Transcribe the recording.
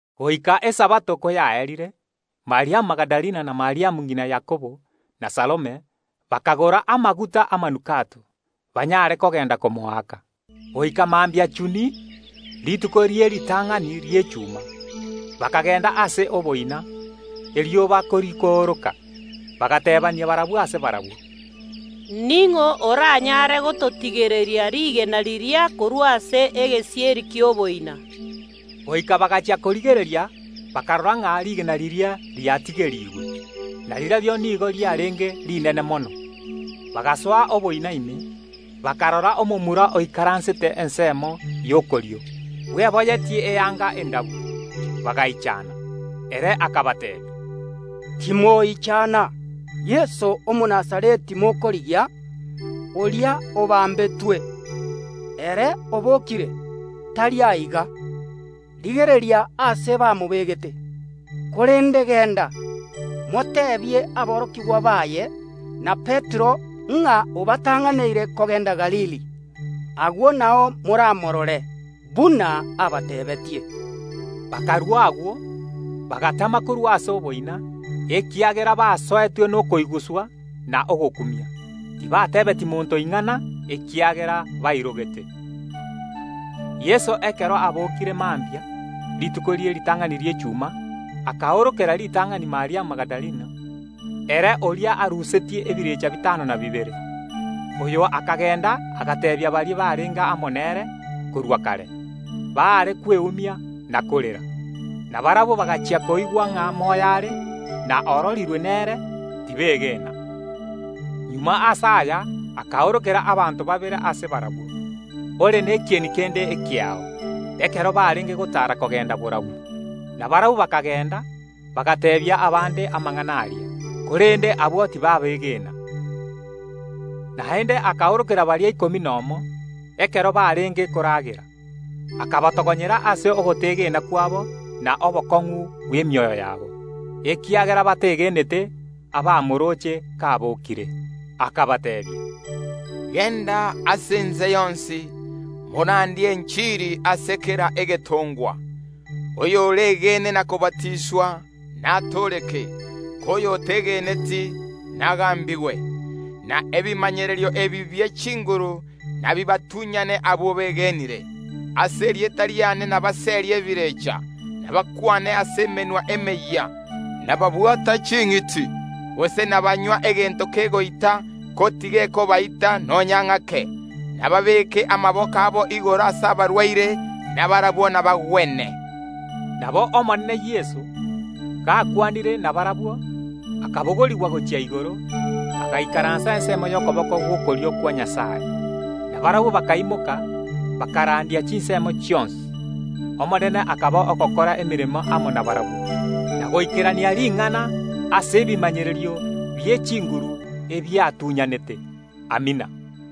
Goika Esabato koyaerire, Mariamu Magidalena, na Mariamu ng’ina Yakobo, na Salome, bakagora amaguta yamanukato, banyare kogenda komoaka. Goika mambia chuni, rituko rie ritang’ani ri’echuma, bakagenda ase oboina, erioba korikooroka. Bagateebania barabwo ase barabwo, “Ning’o oranyare gototigereria rigena riria korwa ase egesieri ki’oboina?” Goika bagachia korigereria bakarora ng’a rigena riria riatigerigwe, na rirorio nigo riarenge rinene mono. Bagasoa oboina ime, bakarora omomura oikaransete ensemo y’okorio, bweboyetie eanga endabu, bakegosa. Ere akabateebia, “Timoichana; Yeso Omonazareti mokorigia, oria obambetwe. Ere obookire, tari aiga. Rigereria aase bamobegete! Korende genda, moteebie aborokigwa baye, na Petero, ng’a obatang’aneire kogenda Galili. Agwo nao moramorore, buna abateebeetie.” Bakarua agwo, bagatama korwa ase oboina, ekiagera basoetwe nekeondoko na ogokumia. Tibateebetie monto ing’ana, ekiagera bairogete. Yeso ekero abookire, mambia rituko rie ritang’ani ri’echuma akaorokera ritang’ani Mariamu Magidalena, ere oria arusetie ebirecha bitano na bibere. Oyo akagenda agateebia baria barenge amo nere korwa kare, baare kweumia na korera. Na barabwo, bagachia koigwa ng’a moyo are, na ororirwe nere, tibegena. Magega ase aya akaorokera abanto babere ase barabwo, ore nekieni kende ekeao, ekero barenge gotaara kogenda borabu. Nabarabwo bakagenda bagateebia abande amang’ana aria, korende abwo tibabegena. Naende akaorokera baria ikomi nomo, ekero barenge koragera; akabatogonyera ase ogotegena kwabo na obokong’u bw’emioyo yabo, ekiagera bategenete abamorooche kabokire. Akabateebia, “Genda ase ense yonsi, morandie enchiri ase kera egetongwa. Oyoregene na kobatiswa, natooreke, ko oyotegeneti, nagambigwe. Na ebimanyererio ebi bie chinguru nabibatunyane abwo begenire: Ase erieta riane nabaserie ebirecha, nabakwane ase emenwa emeyia, nababwata ching’iti, gose nabanywa egento kegoita, ko tigekobaita nonya ng’ake; nababeeke amaboko abo igoro ase abarwaire, na barabwo nabagwene.” Nabo Omonene Yeso, gakwanire nabarabwo, akabogorigwa gochia igoro, agaikaransa ensemo y’okoboko gw’okorio kwa Nyasae. Na barabwo bakaimoka, bakarandia chinsemo chionsi. Omonene akaba ogokora emeremo amo nabarabwo, na goikerania ring’ana ase ebimanyererio bie chinguru ebiabatuny’anete. Amina.